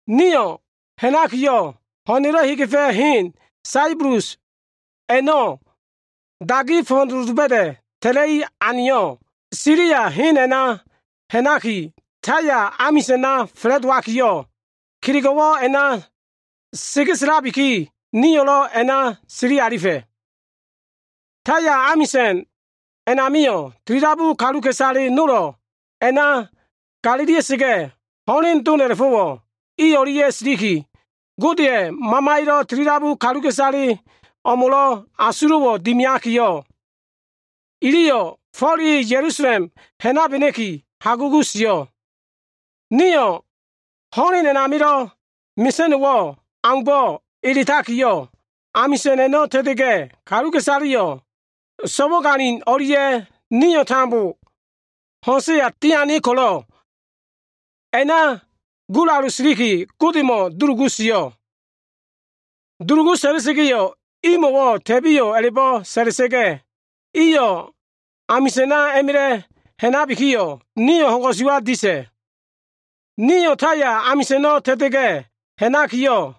Nio꞉ ha꞉nakiyo꞉, ho꞉na꞉lo꞉ hegefa꞉ hen Saibulus a꞉no꞉ dagi fo꞉fo꞉doloba꞉da꞉ ta꞉ta꞉i aneyo꞉, Silia hen a꞉na ha꞉naki Taya amisa꞉na fa꞉la꞉dowakiyo꞉, kelego꞉wo꞉ a꞉na segeselabiki, nio꞉lo꞉ a꞉na sili alifa꞉. Taya amisa꞉n a꞉namio꞉ tilidabu kaluka꞉isale nolo꞉ a꞉na galilia꞉sa꞉ga꞉, ho꞉len dom a꞉la꞉fo꞉wo꞉ i o꞉lia꞉ silikiyo꞉, Godeya꞉ Mamaya꞉yo꞉ tilidabu kaluka꞉isale o꞉mo꞉wo꞉ asulo꞉wo꞉ dimiabiki, iliyo꞉ Fo꞉l e Ya꞉lusalem ha꞉nabena꞉ki hagugu sio꞉. Nio꞉ ho꞉len a꞉namilo꞉ mesa꞉no꞉wo꞉ aumbo꞉ edakiyo꞉, amisa꞉n a꞉no꞉ ta꞉ta꞉ga꞉, kaluka꞉isaleyo꞉ so꞉wagalin o꞉lia꞉ nio꞉ tambo ho꞉nsa꞉ya tia꞉ ko꞉lo꞉, a꞉na gulalu siliki Godemo꞉ dulugu sio꞉. Dulugu sa꞉la꞉sa꞉ga꞉yo꞉ imo꞉wo꞉ ta꞉biyo꞉ a꞉la꞉bo꞉ sa꞉la꞉sa꞉ga꞉, iyo꞉ amisa꞉na a꞉ma꞉la꞉ ha꞉nabikiyo꞉, nio꞉ ho꞉n ko꞉suwa disa꞉. Nio꞉ Taya a꞉no꞉ ta꞉ta꞉ga꞉ ha꞉nakiyo꞉,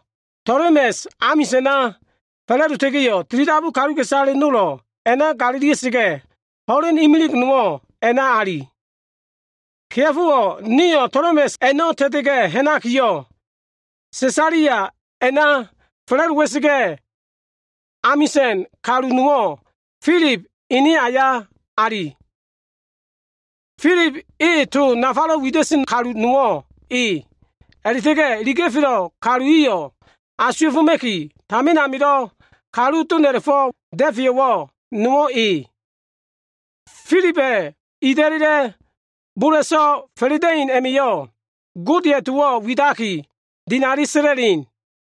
Tolemes amisa꞉na fa꞉la꞉dota꞉ga꞉yo꞉, tilidabu kaluka꞉isale nolo꞉ a꞉na galilia꞉sa꞉ga꞉, ho꞉len imilig nowo꞉ a꞉na ali. Kea꞉fowo꞉ nio꞉ Tolemes a꞉no꞉ ta꞉ta꞉ga꞉ ha꞉nakiyo꞉, Sesalia a꞉na fa꞉la꞉dowa꞉sa꞉ga꞉, amisa꞉n kalu nowo꞉ Filib ene aya ali. Filib e to nafalo꞉ wida꞉sen kalu nowo꞉ e. A꞉la꞉ta꞉ga꞉ iliga꞉felo꞉ kalu iyo꞉ asuwa꞉foma꞉ki, tamin amilo꞉ kalu doma꞉la꞉fo꞉ da꞉feyo꞉wo꞉ nowo꞉ e. Filiba꞉ ida꞉la꞉la꞉ bola꞉so꞉ fa꞉la꞉da꞉in a꞉ma꞉yo꞉ Godeya꞉ towo꞉ widaki, dinali sa꞉la꞉sen.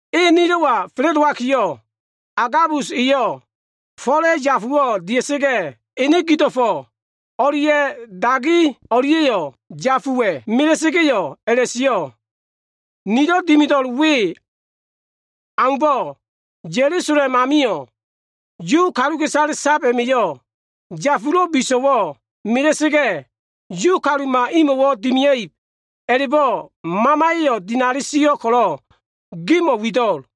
E nilo꞉wa fa꞉la꞉dowakiyo꞉, Agabus eyo꞉ Fo꞉la꞉ yafuwo꞉ dia꞉sa꞉ga꞉, ene gido꞉fo꞉ o꞉lia꞉ dagi o꞉lia꞉yo꞉ yafuwa꞉ mela꞉sa꞉ga꞉yo꞉ a꞉la꞉sio꞉, “Nilo꞉ dimido꞉l we aumbo꞉, Ya꞉lusalem amilo꞉ Yu kalu sab a꞉ma꞉yo꞉ yafulo꞉ biso꞉wo꞉ mela꞉sa꞉ga꞉, Yu kaluma imo꞉wo꞉ dimia꞉ib a꞉la꞉bo꞉ Mamaya꞉yo꞉ dinali sio꞉ ko꞉lo꞉ gimo꞉ wido꞉l.”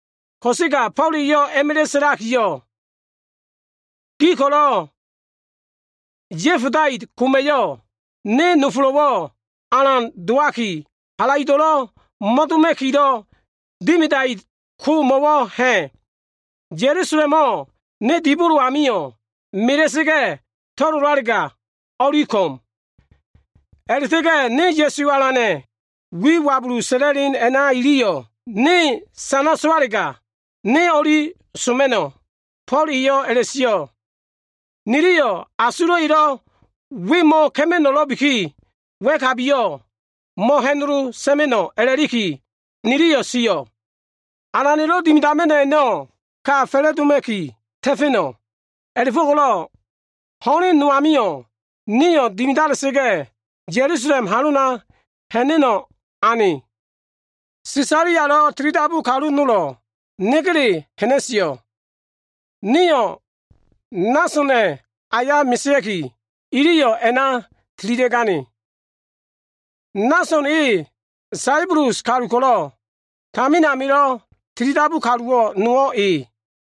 Ko꞉sega Fo꞉l eyo꞉ a꞉ma꞉la꞉ sa꞉lakiyo꞉, “Gi ko꞉lo꞉ ya꞉fodait koma꞉yo꞉, ne nofolo꞉wo꞉ alan dowaki, halaido꞉lo꞉ mo꞉doma꞉kilo꞉ dimidait ko mo꞉wo꞉ ha꞉? Ya꞉lusalemo꞉ ne dibolo amio꞉ mela꞉sa꞉ga꞉ to꞉lolalega o꞉li ko꞉m. A꞉la꞉ta꞉ga꞉ ne Ya꞉su Alana꞉ wi wabulu sa꞉la꞉len a꞉na iliyo꞉ ne sana sowalega, ne o꞉li soma꞉no꞉” Fo꞉l eyo꞉ a꞉la꞉sio꞉. Niliyo꞉ asulo꞉ elo꞉ we mo꞉ka꞉ma꞉no꞉lo꞉biki, wa꞉kabiyo꞉ mo꞉ha꞉nolo sa꞉ma꞉no꞉ a꞉la꞉likiyo꞉, niliyo꞉ sio꞉, “Alana꞉lo꞉ dimidama꞉no꞉ a꞉no꞉ ka fa꞉la꞉doma꞉ki ta꞉fa꞉no꞉.” A꞉la꞉fo꞉ko꞉lo꞉ ho꞉len no amio꞉ nio꞉ dimidalia꞉sa꞉ga꞉, Ya꞉lusalem halona ha꞉na꞉no꞉ ane. Sesalialo꞉ tilidabu kalu nolo꞉ negele ha꞉na꞉sio꞉. Nio꞉ Nasona꞉ aya mesea꞉ki, iliyo꞉ a꞉na tililia꞉gane. Nason e Saibulus kalu ko꞉lo꞉ tamin amilo꞉ tilidabu kalu dowo꞉wo꞉ nowo꞉ e.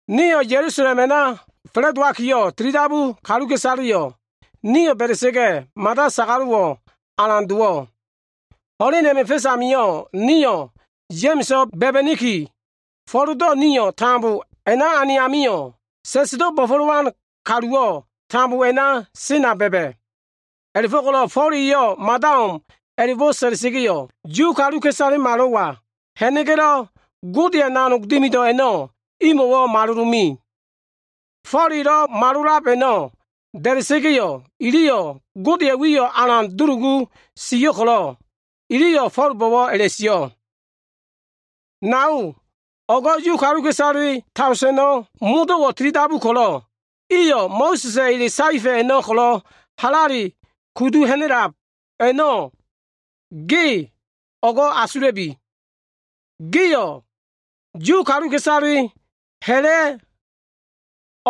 Nio꞉ Ya꞉lusalem a꞉na fa꞉la꞉dowabiki, tilidabu kaluka꞉isaleyo꞉ ni ba꞉da꞉ga꞉yo꞉ mada sagalo꞉wo꞉ alan dowo꞉. Ho꞉len a꞉ma꞉ fa꞉s amio꞉, nio꞉ Ya꞉ma꞉so꞉ ba꞉ba꞉niki, Fo꞉ldo꞉ nio꞉ tambo a꞉na ane amio꞉, sa꞉sdo꞉ bo꞉fo꞉lowan kaluwo꞉ tambo a꞉na sena ba꞉ba꞉. A꞉la꞉fo꞉ko꞉lo꞉ Fo꞉l eyo꞉ mada o꞉m a꞉la꞉bo꞉ sa꞉la꞉sa꞉ga꞉yo꞉, Yu kaluka꞉isalemalo꞉wa ha꞉na꞉ga꞉lo꞉, Godeya꞉ nanog dimido꞉ a꞉no꞉, imo꞉wo꞉ malolo꞉ me. Fo꞉l elo꞉ malolab a꞉no꞉ da꞉da꞉sa꞉ga꞉yo꞉, iliyo꞉ Godeya꞉ wiyo꞉ a꞉na dulugu sio꞉ ko꞉lo꞉, iliyo꞉ Fo꞉lbo꞉wo꞉ a꞉la꞉sio꞉, “Nao, o꞉go꞉ Yu kaluka꞉isale daoseno꞉ modo꞉wo꞉ tilidabu ko꞉lo꞉, iyo꞉ Mo꞉sa꞉sa꞉ ele saefa꞉ a꞉no꞉ ko꞉lo꞉ halale kudu ha꞉na꞉lab a꞉no꞉ ge o꞉go꞉ asula꞉bi. Giyo꞉ Yu kaluka꞉isaleyo꞉ ha꞉la꞉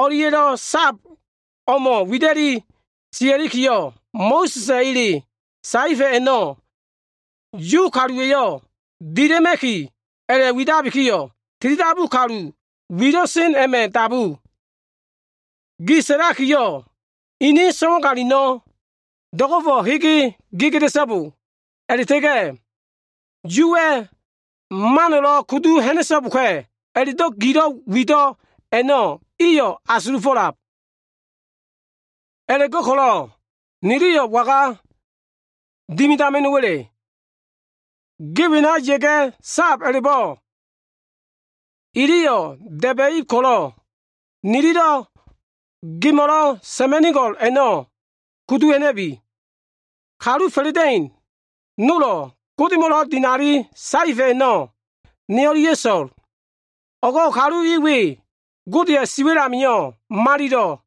o꞉lia꞉lo꞉ sab o꞉mo꞉ wida꞉li siakiyo꞉, Mo꞉sa꞉sa꞉ ele saefa꞉ a꞉no꞉ Yu kaluwa꞉yo꞉ dila꞉ma꞉ki, a꞉la꞉widabikiyo꞉, tilidabu kalu wilo꞉ sen a꞉ma꞉ dabu. Gi sa꞉lakiyo꞉, inin so꞉wagalino꞉ do꞉go꞉fo꞉ hege gedea꞉so꞉bo a꞉la꞉ta꞉ga꞉ Yuwa꞉ mano꞉lo꞉ kudu ha꞉na꞉so꞉boka꞉ a꞉la꞉do꞉ gilo꞉ wido꞉ a꞉no꞉ iyo꞉ asulufo꞉lab. A꞉la꞉go꞉ko꞉lo꞉ niliyo꞉ waga dimidama꞉no꞉wa꞉le? Ge wena ya꞉ga꞉ sab a꞉la꞉bo꞉ iliyo꞉ da꞉ba꞉ib ko꞉lo꞉, nililo꞉ gemo꞉lo꞉ sa꞉ma꞉nigo꞉l a꞉no꞉ kudu ha꞉na꞉bi. Kalu fa꞉la꞉da꞉in nolo꞉ Godemo꞉lo꞉ dinali saefa꞉ a꞉no꞉ ne o꞉lia꞉ so꞉l. O꞉go꞉ kalu i we, Godeya꞉ siwa꞉l amio꞉ malilo꞉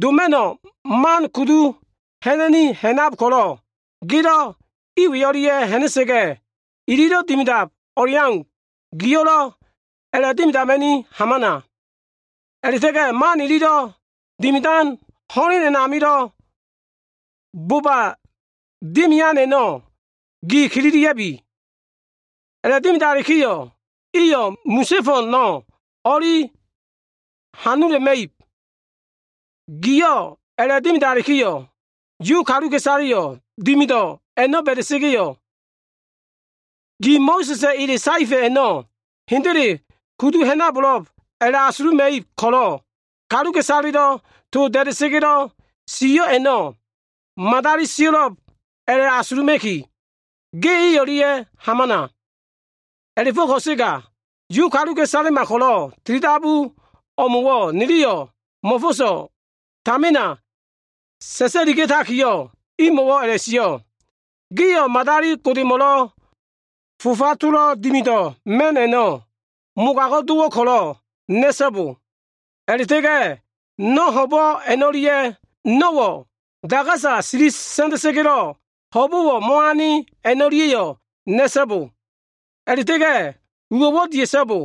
doma꞉no꞉ man a꞉no꞉ kudu ha꞉na꞉ni ha꞉nab ko꞉lo꞉, gelo꞉ i we o꞉lia꞉ ha꞉na꞉ga꞉ ililo꞉ dimidab o꞉leau, giyo꞉lo꞉ a꞉la꞉dimidama꞉ni hamana. A꞉la꞉ta꞉ga꞉ man ililo꞉ dimidan ho꞉len a꞉namilo꞉ boba dimian a꞉no꞉ gi kililia꞉bi. A꞉la꞉dimidalikiyo꞉, iyo꞉ misa꞉ fo꞉no꞉ o꞉li hanula꞉ma꞉ib. Giyo꞉ a꞉la꞉dimidalikiyo꞉, Yu kaluka꞉isaleyo꞉ dimido꞉ a꞉no꞉ ba꞉da꞉sa꞉ga꞉yo꞉, ge Mo꞉sa꞉sa꞉ ele saefa꞉ a꞉no꞉ hendele kudu ha꞉nabo꞉lo꞉b a꞉la꞉asuluma꞉ib ko꞉lo꞉, kaluka꞉isaleya꞉lo꞉ to sio꞉ ko꞉lo꞉ dabu a꞉no꞉ madali sio꞉lo꞉b a꞉la꞉asuluma꞉ki, ge i o꞉lia꞉ hamana. “A꞉la꞉fo꞉ ko꞉sega, Yu kaluka꞉isalema ko꞉lo꞉ tilidabu o꞉mo꞉wo꞉ niliyo꞉ mo꞉fo꞉so꞉ tamina sa꞉sa꞉liga꞉takiyo꞉, imo꞉wo꞉ a꞉la꞉sio꞉, ‘Gio꞉ madali godemo꞉lo꞉ fofa tolo꞉ dimido꞉ ma꞉no꞉ a꞉no꞉ mogago꞉ dowo꞉ ko꞉lo꞉ na꞉so꞉bo. A꞉la꞉ta꞉ga꞉ no꞉ ho꞉bo꞉ a꞉no꞉lia꞉, no꞉wo꞉ dagasa sili sa꞉nda꞉sa꞉ga꞉lo꞉ ho꞉bo꞉wo꞉ mo꞉ane a꞉no꞉lia꞉yo꞉, na꞉so꞉bo. A꞉la꞉ta꞉ga꞉ uwo꞉wo꞉ dia꞉so꞉bo.’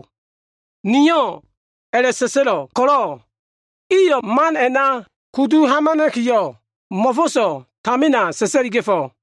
Nio꞉ a꞉la꞉sa꞉sa꞉lo꞉ ko꞉lo꞉, iyo꞉ man a꞉na kudu hamana꞉kiyo꞉, mo꞉fo꞉so꞉ tamina sa꞉sa꞉liga꞉fo꞉.”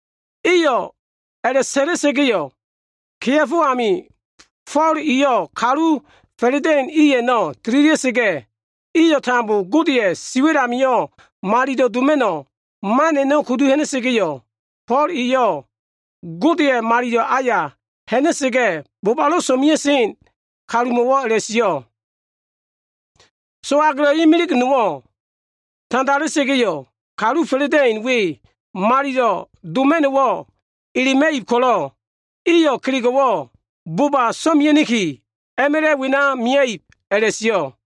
Iliyo꞉ a꞉la꞉sa꞉la꞉sa꞉ga꞉yo꞉, kea꞉fo amio꞉ Fo꞉l eyo꞉ kalu fa꞉la꞉da꞉in i a꞉no꞉ tililia꞉sa꞉ga꞉, iyo꞉ tambo Godeya꞉ siwa꞉l amio꞉ malilo꞉ doma꞉no꞉ man a꞉no꞉ kudu ha꞉na꞉sa꞉ga꞉yo꞉, Fo꞉l eyo꞉ Godeya꞉ malilo꞉ aya ha꞉na꞉sa꞉ga꞉, bobalo꞉ so꞉mea꞉sen kalumo꞉wo꞉ a꞉la꞉sio꞉, “So꞉agelo꞉ imilig nowo꞉ tandala꞉ta꞉ga꞉yo꞉, kalu fa꞉la꞉da꞉in we malilo꞉ doma꞉no꞉wo꞉ elema꞉ib ko꞉lo꞉, iyo꞉ kelego꞉wo꞉ boba so꞉mena꞉ki, a꞉ma꞉la꞉ wena mia꞉ib” a꞉la꞉sio꞉.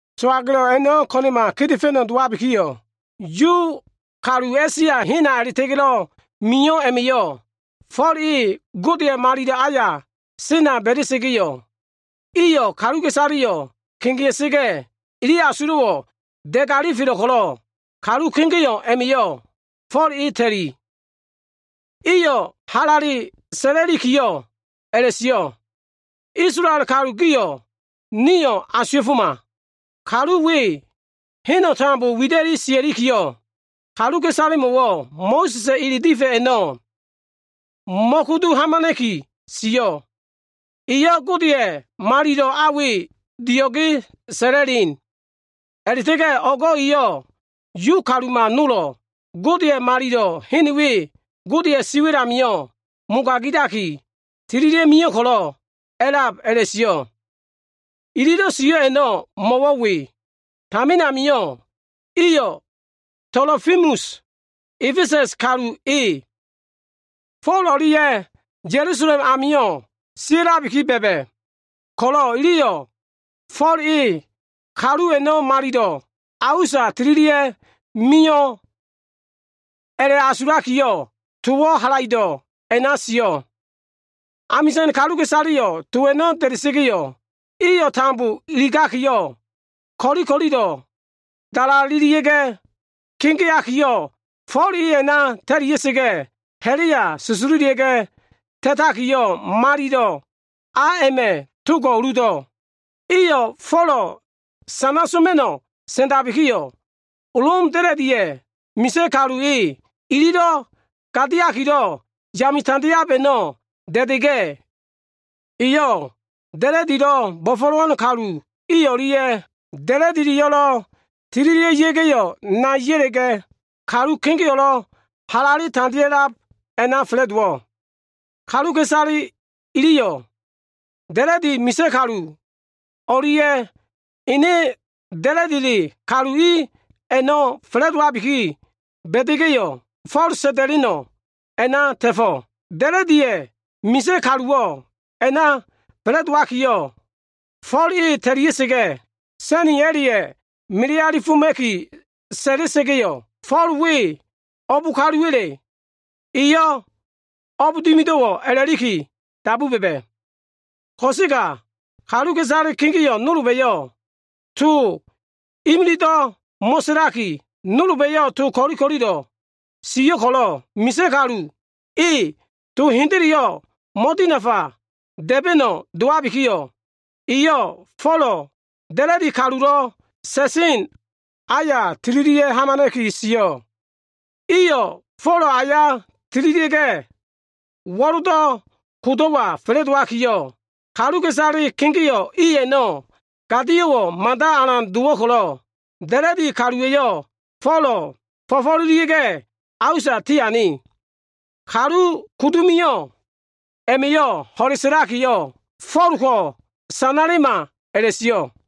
So꞉agelo꞉ a꞉no꞉ ko꞉na꞉ma kedefa꞉no꞉ dowabikiyo꞉, Yu kalu A꞉sia hena a꞉la꞉ta꞉ga꞉lo꞉ mio꞉ a꞉ma꞉yo꞉, Fo꞉l e Godeya꞉ malilo꞉ aya sena ba꞉da꞉ga꞉yo꞉, iyo꞉ kaluka꞉isaleyo꞉ kegea꞉sa꞉ga꞉, ili asulo꞉wo꞉ da꞉ga꞉ alifelo꞉ ko꞉lo꞉, kalu kegeo꞉ a꞉ma꞉yo꞉ Fo꞉l e ta꞉li. Iyo꞉ halale sa꞉la꞉likiyo꞉ a꞉la꞉sio꞉, “Isolael kalu gio꞉ nio꞉ asuwa꞉foma. Kalu we, heno꞉ tambo wida꞉li sia꞉likiyo꞉, kaluka꞉isalemo꞉wo꞉ Mo꞉sa꞉sa꞉ ele difa꞉ a꞉no꞉ mo꞉kudu hamana꞉ki sio꞉. Eyo꞉ Godeya꞉ malilo꞉ a we dio꞉ge sa꞉la꞉len. A꞉la꞉ta꞉ga꞉ o꞉go꞉ eyo꞉ Yu kaluma nolo꞉ Godeya꞉ Malilo꞉ hen we Godeya꞉ siwa꞉l amio꞉ mogagabiki, tililia꞉ mio꞉ ko꞉lo꞉ a꞉lab” a꞉la꞉sio꞉. (Ililo꞉ sio꞉ a꞉no꞉ mo꞉wo꞉ we. Tamin amio꞉, iyo꞉ Tolofimus, A꞉fesa꞉s kalu e, Fo꞉l o꞉lia꞉ Ya꞉lusalem amio꞉ sia꞉labiki ba꞉ba꞉ ko꞉lo꞉, iliyo꞉ Fo꞉l e kalu a꞉no꞉ malilo꞉ a usa tililia꞉ mio꞉ a꞉la꞉asulakiyo꞉, towo꞉ halaido꞉ a꞉na sio꞉.) Amisa꞉n kaluka꞉isaleyo꞉ to a꞉no꞉ da꞉da꞉ga꞉yo꞉, iyo꞉ tambo iligaki, ko꞉li ko꞉lilo꞉ dalalelia꞉ga꞉ kegeakiyo꞉, Fo꞉l e a꞉na ta꞉lia꞉sa꞉ga꞉, ha꞉la꞉ya susululia꞉ga꞉ ta꞉takiyo꞉, malilo꞉ a a꞉ma꞉ togo꞉ uludu alifa꞉. Iyo꞉ Folo꞉ sanala꞉ma꞉no꞉ sa꞉ndabikiyo꞉, Lom da꞉la꞉diya꞉ misa꞉ kalu e, ililo꞉ gadiakilo꞉ yame tandeab a꞉no꞉ da꞉da꞉ga꞉, eyo꞉ da꞉la꞉dilo꞉ bo꞉fo꞉lowan kalu i o꞉lia꞉ da꞉la꞉dileyo꞉lo꞉ tililia꞉ga꞉yo꞉ nai ya꞉la꞉ga꞉, kalu kegeo꞉lo꞉ halale tandea꞉lab a꞉na fa꞉la꞉dowo꞉. Kaluka꞉isale iliyo꞉ da꞉la꞉di misa꞉ kalu o꞉lia꞉ ene da꞉la꞉dile kalu i a꞉no꞉ fa꞉la꞉dowabiki ba꞉da꞉ga꞉yo꞉, Fo꞉l sa꞉nda꞉leno꞉ a꞉na ta꞉fo꞉. Da꞉la꞉diya꞉ misa꞉ kaluwo꞉ a꞉na fa꞉la꞉dowakiyo꞉, Fo꞉l e ta꞉lia꞉sa꞉ga꞉, sa꞉ni a꞉la꞉ya꞉ melealifoma꞉ki sa꞉la꞉sa꞉ga꞉yo꞉, Fo꞉l we o꞉b kaluwa꞉le, a꞉la꞉ta꞉ga꞉ eyo꞉ o꞉b dimido꞉wo꞉ a꞉la꞉liki dabu ba꞉ba꞉. Ko꞉sega kaluka꞉isale kegeo꞉ nolba꞉yo꞉ to imilido꞉ mo꞉sa꞉laki, nolba꞉yo꞉ to ko꞉li ko꞉lilo꞉ sio꞉ ko꞉lo꞉, misa꞉ kalu e to hendeleyo꞉ mo꞉dinafa da꞉ba꞉no꞉ dowabikiyo꞉, eyo꞉ Folo꞉ da꞉la꞉di kalulo꞉ sa꞉sen aya tililia꞉ hamana꞉ki sio꞉. Iyo꞉ Folo꞉ aya tililia꞉ga꞉, wo꞉ldo꞉ kodo꞉wa fa꞉la꞉dowabikiyo꞉, kaluka꞉isale kegeo꞉ i a꞉no꞉ gadio꞉wo꞉ mada alan dowo꞉ ko꞉lo꞉, da꞉la꞉di kaluwa꞉yo꞉ Folo꞉ fo꞉fo꞉lelia꞉ga꞉ a usa tiane. Kalu kudu mio꞉ a꞉ma꞉yo꞉ ho꞉le sa꞉lakiyo꞉, “Fo꞉l ko sanalema!” a꞉la꞉sio꞉.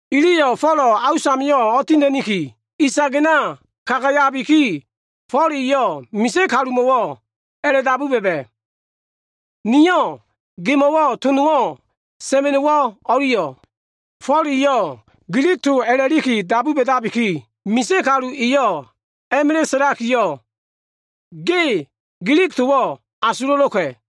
Iliyo꞉ Folo꞉ a usamio꞉ o꞉tina꞉niki, isagena kagayabikiyo꞉, Fo꞉l eyo꞉ misa꞉ kalumo꞉wo꞉ a꞉la꞉dabu ba꞉ba꞉, “Niyo꞉ gemo꞉wo꞉ to nowo꞉ sa꞉ma꞉no꞉wo꞉ o꞉liyo꞉?” Fo꞉l eyo꞉ Gilig to a꞉la꞉liki dabu ba꞉dabiki, misa꞉ kalu eyo꞉ a꞉ma꞉la꞉ sa꞉lakiyo꞉, “Ge Gilig towo꞉ asulo꞉lo꞉ka꞉?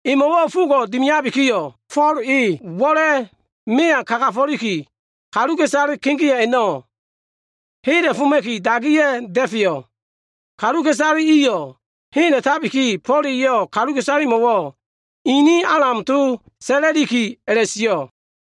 Emo꞉wo꞉ fogo꞉ dimiabikiyo꞉, Fo꞉l e wo꞉la꞉ mea kagafo꞉liki, kaluka꞉isale kegeo꞉ a꞉no꞉ hela꞉foma꞉ki, dagiya꞉ da꞉feyo꞉. Kaluka꞉isale iyo꞉ hela꞉tabiki, Fo꞉l eyo꞉ kaluka꞉isalemo꞉wo꞉ inin Alam to sa꞉la꞉likiyo꞉ a꞉la꞉sio꞉.